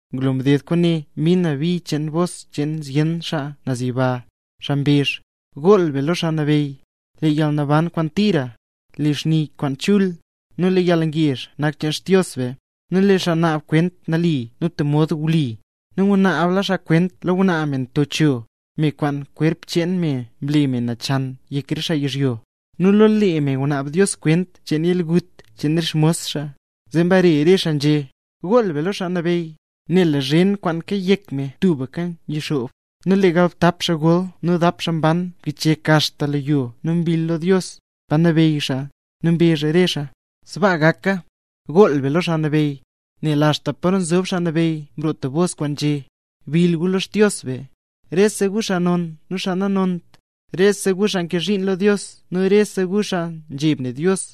Ngulo mded kwaane mbin na bi cheen bos cheen zyen xaa naz yiba, xaa mbezh: ¡Gool be lo Xaa Nabeyy! Lee yalnaban kwaan tira, lee xni kwaan chul, nu lee yalngezh nak cheen Xdios be, nel lee xaa naab kwent nali nu tub mod wli; nu ngunaabla xaa kwent lo ngwnaa me nto cho, me kwaan kwerp cheen me mle nachan yek re xaa yizhyo; nu lo lee me ngunaab Dios kwent cheen yalgut cheen re xmos Dios. Zeera mbare re xaa nzhé: —¡Gool be lo Xaa Nabeyy! Nel lee zhen kwaan nroo kayek me tubka yixoob. Nu lee galbtap xaa gol nu dap xaa mban mkichyek axta lo yo nu mbill lo Dios, xaa nzob naz pa nabeyy xaa. Nu mbezh re xaa: —¡Sbaa gaka! ¡Gool be lo Xaa Nabeyy! Zee axta paro nzob Xaa Nabeyy mroo tub bos kwaan nzhé: ¡Bill gu lo Xdios be, rese gu xaa non nu xaa nanont, rese gu xaa nkee zhiin lo Dios nu rese gu xaa nzheb ne Dios!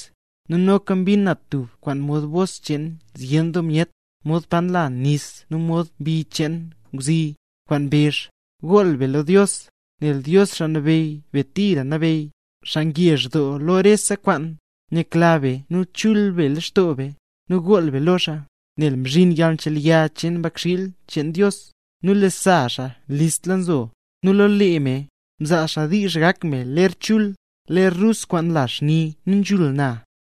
Nu noka mbin na tub kwaan mod bos cheen zyen doo myet, mod pa nla nis nu mod bi cheen ngwzi, kwaan mbezh: ¡Gool be lo Dios! Nel Dios, Xaa Nabeyy be tira nabeyy, xaa ngezh doo lo rese kwaan. Yakla be nu le chul be lextoo be, nu gool be lo xaa, nel mzhinla yalnchelya cheen Mbakxiil cheen Dios, nu lee sa xaa listla nzo. Nu lo lee me, mzaa xaa diizh gak me ler chul, ler rus kwaan nla xni nu nzhul na.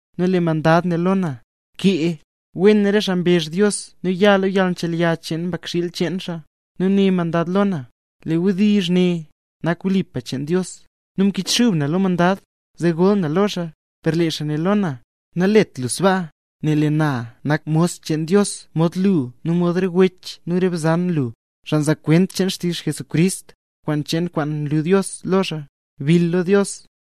Nu lee mandad né lo na: —Bkee: “Wen re xaa mrezh Dios nu ya xaa lo yalnchelya cheen Mbakxiil cheen Dios”. Nu né mandad lo na: —Lee re wdizh ne nak wlipa cheen Dios. Nu mkichxub na lo mandad, zee gol na lo xaa. Per lee xaa né lo na: —Nalet lu sbaa, nel lee na nak mos cheen Dios mod lu nu mod re wech lu nu re bzan lu, xaa nzaa kwent cheen xtizh Jesucrist, kwent cheen kwaan mlu Dios lo xaa. Bill lo Dios.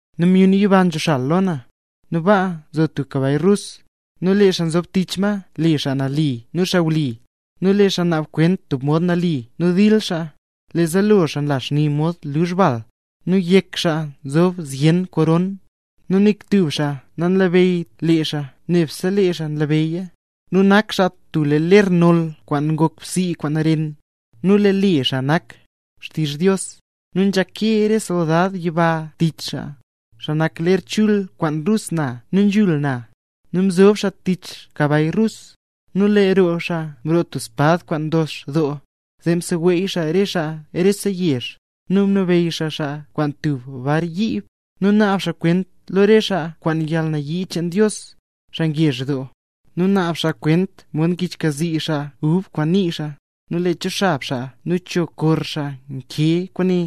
Nu myun yiba nzoxal lo na, nu baa nzo tub kabay rus, nu lee xaa nzob tich ma le Xaa Nali nu Xaa Wli; nu lee xaa naab kwent tub mod nali nu dil xaa. Lee zaalo xaa nla xni mod luzh bal, nu yek xaa nzob zyen koron, nu nik tub xaa nanlabeyyt le xaa nebse lee xaa nlabeyya. Nu nak xaa tub lee ler noll kwaan ngok bsii kwaan ren, nu lee le xaa nak Xtizh Dios. Nu nzhake re soldad yiba tich xaa, xaa nak ler chul kwaan rus na nu nzhul na, nu nzob xaa tich kabay rus. Nu lee roo xaa nroo tub espad kwaan ndox doo, zee seweey xaa re xaa rese yezh. Nu nabeyy xaa xaa kwaan tub bar yiib. Nu naab xaa kwent lo re xaa kwaan yalnayii cheen Dios, xaa ngezh doo. Nu naab xaa kwent mod ngichxkazii xaa ub kwaan nii xaa. Nu lee cho xab xaa nu cho kor xaa nkee kwaane: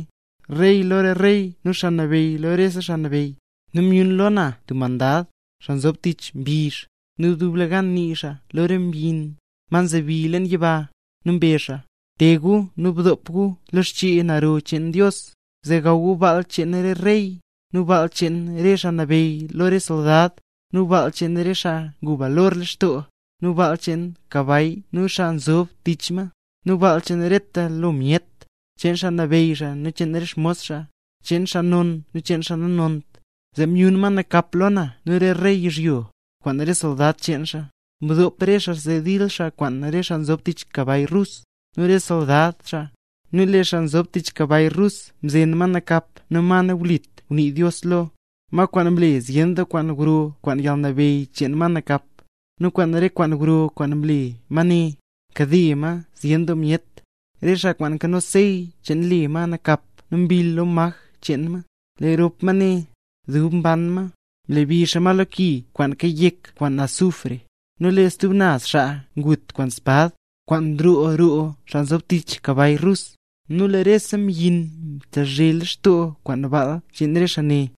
“Rey lo re rey nu Xaa Nabeyy lo re xaa nabeyy”. Nu myun lo na tub mandad, xaa nzob tich mbizh, nu dublegan nii xaa lo re mbyin, ma nzebi leen yiba, nu mbezh xaa: —¡Te gu nu bdop gu lo xchee naro cheen Dios, zee gaw gu baal cheen re rey, nu baal cheen re xaa nabeyy lo re soldad, nu baal cheen xaa ngu balor lextoo, nu baal cheen kabay nu xaa nzob tich ma, nu baal cheen reta lo myet, cheen xaa nabeyy nu cheen re xmos xaa, cheen xaa non nu cheen xaa nanont! Zee myun ma nakap lo na nu re rey yizhyo, kwaan re soldad cheen xaa, mdop re xaa zee dil xaa kwaan xaa nzob tich kabay rus, nu re xsoldad xaa. Nu lee xaa nzob tich kabay rus mzen ma nakap nu ma nawlit ngunii Dios lo, ma kwaan mle zyen doo kwaan gro kwaan yalnabeyy cheen ma nakap. Nu kwaan re kwaan gro kwaan mle ma ne, mkade ma zyen doo myet, re xaa kwaan nkano sey cheen le ma nakap nu mbill lo maj cheen ma. Lee rop ma ne, dub mban ma, mlebi xaa ma lo ki kwaan kayek kwaan azufre. Nu lee re stub naz xaa ngut kwaan espad, kwaan nroo roo xaa nzob tich kabay rus, nu lee rese mbyin mtezhe lextoo kwaan baal cheen re xaa ne.